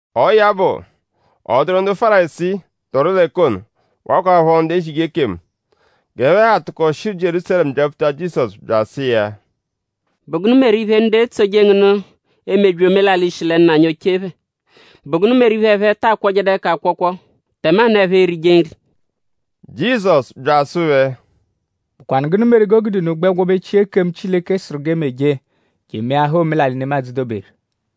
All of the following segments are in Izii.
Ọo ya bụ; ọ dụru ndu Fárisii, dọru l'ẹka ono; wakwaphọ ndu ezije ekemu. G'ẹphe ha tụko shi Jierúsalẹmu byapfuta Jizọsu bya asụ iya: “?Bụ gụnu meru iphe, ndu etsoje ngu nụ emebyi omelalị, shi lẹ nna anyi oche phẹ??Bụ gụnu meru iphe, ẹphe ta akwọjedu ẹka akwọkwo tẹmanu ẹphe erije nri?” Jizọsu bya asụ phẹ: “?Bụkwanu gụnu meru g'o gude unu gbẹ gwọbechia ekemu, Chileke sụru g'e meje je emeahaa omelalị, nemadzụ doberu?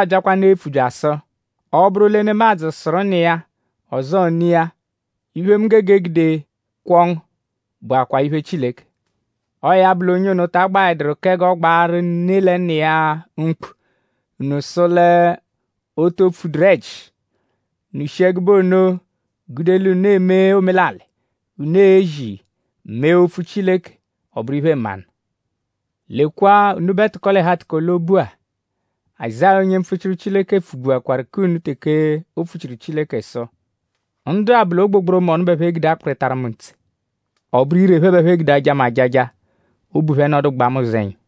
Unubẹdua byakwanụ epfu bya asụ: ‘Ọ -bụru lẹ nemadzụ sụru nna iya; ọzoo ne iya: Iphe, mu gege egude kwọo ngu bụakwaa iphe Chileke.’ ‘Ọo ya bụ l'onye ono ta agbaẹduru kẹ g'ọ gbaaru ne lẹ nna iya mkpu.’ Unu sụ l'o to pfuduru ẹji. Unu shi ẹgube ono gude l'unu eme omelalị, unu ezi; mee Opfu Chileke ọ bụru iphe-mmanụ. Lekwa unubẹ tụko-l'ẹhu-atụko-l'obu-a! Azáya, onye mpfuchiru Chileke pfugbuakwaru k'unu teke o pfuchiru Chileke sụ: “Ndu-a bụ l'ogbogboromọnu bẹ ẹphe gude akpịritaru mu ntse. Ọ bụru ire bẹ ẹphe gude aja mu ajaja; obu phẹ nọdugbaa mu ụzenya.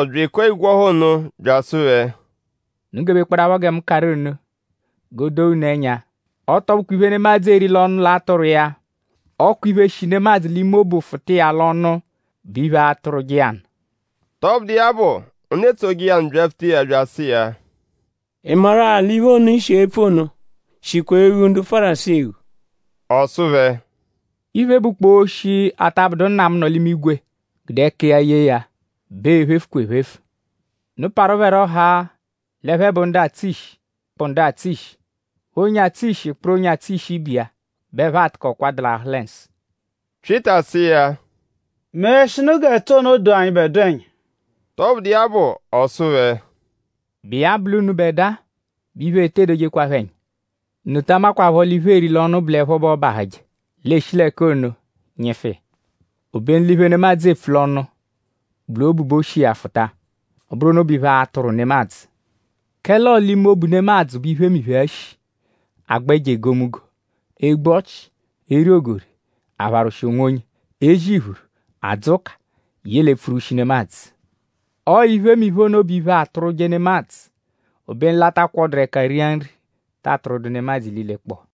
Jizọsu bya ekua igwe ọha ono; bya asụ phẹ: “Unu gebekpọdapho gẹ mu karụ unu g'o doo unu ẹnya. Ọ tọ bụkwa iphe, nemadzụ eri l'ọnu atụrwu iya; ọ kwa iphe, shi nemadzụ l'ime obu fụta iya l'ọnu bụ iphe, atụrwuje iya nụ.” Tọbudu iya bụ; ndu etsoje iya nụ byapfuta iya bya asụ iya: “?Ị maru-a l'iphe ono, i shi epfu ono shikwa eghu ndu Fárisii eghu?” Ọ sụ phẹ: “Iphe, bụkpoo oshi, ata bụdu Nna mu, nọ l'imigwe gude ẹka iya yee ya bẹ ee-phefukwa ephefu. Unu parụ phẹ rọ haa l'ẹphe bụ ndu atsụ ishi, kpụ ndu atsụ ishi. Onye atsụ ishi -kpụru onye atsụ ishi ibe iya bẹ ẹphe a-tụkokwa dalahụ lẹ nsụ.” Pyịta sụ iya: “Meẹshinu g'ẹtu ono doo anyịbedua ẹnya.” Tọbudu iya bụ; ọ sụ phẹ: “?Bụ iya bụ l'unubẹdua bẹ iphe ete dojekwaphọ ẹnya? Unu ta amakwaphọ l'iphe, eeri l'ọnu bụ l'ẹpho bẹ ọobahuje; l'eeshi l'ẹka ono nyịfu iya. Obenu l'iphe, nemadzụ epfu l'ọnu bụ l'obu bẹ o shi iya fụta. Ọ bụru ono bụ iphe, atụrwu nemadzụ. Kẹle ọo l'ime obu nemadzụ bẹ iphemiphe-a shi: agba ẹjo egomunggo; egbu ọchi; eri ogori; apharwụshi onwonye; ezi iphuru; adzụ ụka; yẹle epfurwushi nemadzụ. Ọo iphemiphe ono bụ iphe, atụrwuje nemadzụ. Obenu l'a ta kwọduru ẹka ria nri tee atụrwudu nemadzụ ililekpọo.”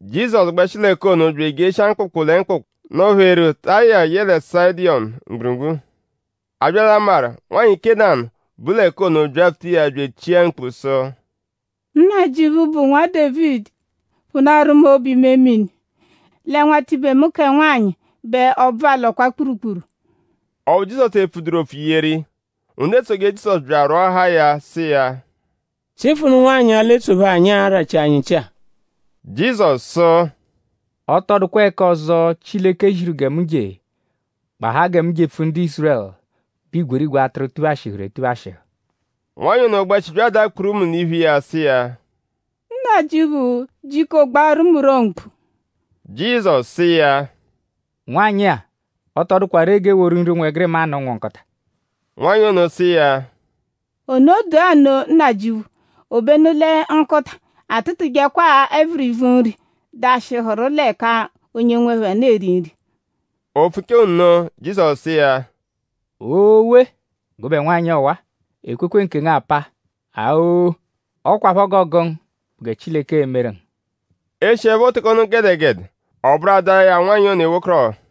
Jizọsu gbẹshi l'ẹka ono bya ejeshia mkpụkpu lẹ mkpụkpu, nọ-pheru Taya yẹle Sayịdonu mgburugburu. A bya l'amarụ; nwanyị Kénanu, bu l'ẹka ono byapfuta iya bya echia mkpu sụ: “Nnajịuphu, bụ Nwa Dévidi! Phụnaaru mu obu-imemini! Lẹ nwatibe mu kẹ nwanyị bẹ ọbvu alọkwa kpurukpuru.” Ọphu Jizọsu epfuduru opfu yeru iya. Ndu etsoje Jizọsu bya arwọahaa ya sụ iya: “Chịfunu nwanyị-a, l'etsophe anyi arachi anyi nchị-a.” Jizọsu sụ: “Ọ tọ dụkwa ẹka ọzo, Chileke ziru gẹ mu je; gbahaa gẹ mu jepfu ndu Ízurẹlu, bụ igwerigwe atụru, tuphashịhuru etuphashịhu.” Nwanyị ono gbẹshi bya adaa kpurumu l'iphu iya sụ iya: “Nnajịuphu; jiko gbaaru mu rọ mkpu.” Jizọsu sụ iya: “Nwanyị-a; ọ tọ dụkwa ree g'e woru nri ụnwegirima nụ ụnwu nkụta.” Nwanyị ono sụ iya: “Ono dụa nno Nnajịuphu! Obenu lẹ nkụta atụtujekwaa ẹvirivi nri, dashịhuru l'ẹka onye nwe phẹ nụ eri nri.” O pfuchaa nno; Jizọsu sụ iya: “Oowee! Gụbe nwanyị ọwa-a! Ekwekwe nkengu apaa. Aa-o! Ọ kwaphọ g'ọogu ngu bụ gẹ Chileke e-meru ngu.” E shiẹpho teke ono gẹdegede; ọ bụru ada iya nwanyị ono ewekọrohu.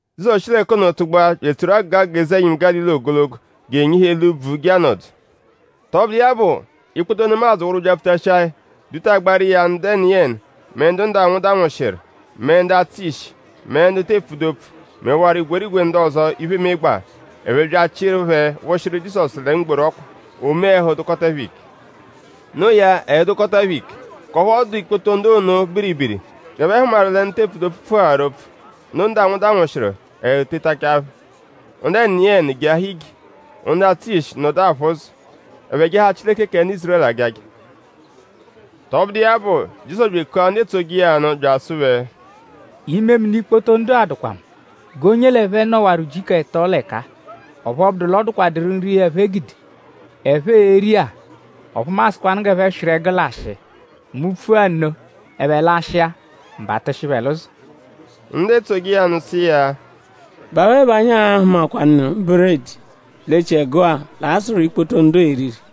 Jizọsu shi l'ẹka ono tụgbua bya etsoru agụga agụga eze-ẹnyimu Gálili ogologo; je enyihu eli úbvú je anọdu. Tọbudu iya bụ; ikpoto nemadzụ wụru byapfutashia ya; dutagbaaru iya ndu ẹniyeni; mẹ ndu ndanwụ danwụshiru; mẹ ndu atsụ ishi; mẹ ndu te epfudu opfu; mẹwaro igwerigwe ndu ọzo, iphe emegbaa. Ẹphe bya achịru phẹ wụshiru Jizọsu lẹ mgboru ọkpa. O mee; ẹhu dụkota phẹ ike. No iya; ẹhu dụkota phẹ ike; k'ọphu ọ dụ ikpoto ndu ono biribiri g'ẹphe hụmaru lẹ ndu te epfudu opfu pfuaharu opfu; ndu ndanwụ danwụshiru; ẹhu tetachaa phẹ. Ndu ẹniyeni jeahaa ije; ndu atsụ ishi nọdu aphụ ụzo. Ẹphe jaahaa Chileke kẹ ndu Ízurẹlu ajaja. Tọbudu iya bụ; Jizọsu bya ekua ndu etsoje iya nụ bya asụ phẹ: “Imemini ikpoto ndu-a dụkwa mu; g'onye l'ẹphe nọwaru ujiku ẹto l'ẹka-a; ọphu ọ bụdu l'ọ dụkwaduru nri, ẹphe gude, ẹphe e-ri-a. Ọphu mu a-sụkwanu g'ẹphe swịru ẹgu lashịa. Mu -pfua nno; ẹphe lashịa; m̀bà atụshi phẹ l'ụzo.” Ndu etsoje iya nụ sụ iya: “?Bụ awe bẹ anyi a-hụmakwanu buredi l'echiẹgu-a, l'a-sụ ikpoto ndu-a eriri?”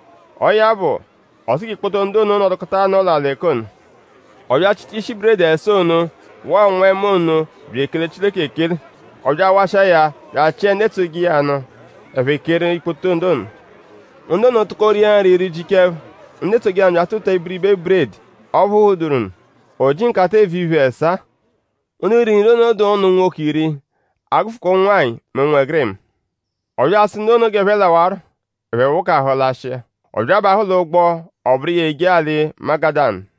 Ọo ya bụ; ọ sụ g'ikpoto ndu ono nọdukota anọo l'alị l'ẹka ono. Ọ bya achịta ishi buredi ẹsaa ono waa ụnwu-ẹma ono bya ekele Chileke ekele. Ọ bya awashịa ya bya achịe ndu etsoje iya nụ; ẹphe keeru ikpoto ndu ono. Ndu ono tụko ria nri rijichaa ẹpho. Ndu etsoje iya nụ bya atụtua ibiribe buredi ọphu ghuduru nụ; o ji nkata-eevu-iphe ẹsaa. Ndu riru nri ono dụ ụnu unwoke iri; a -gụfukwa ụnwanyi mẹ ụnwegirima. Ọ bya asụ ndu ono g'ẹphe lawarọ. Ẹphe wụkahu lashịa. Ọ bya abahụ l'ụgbo; ọ bụru iya eje alị Magadanu.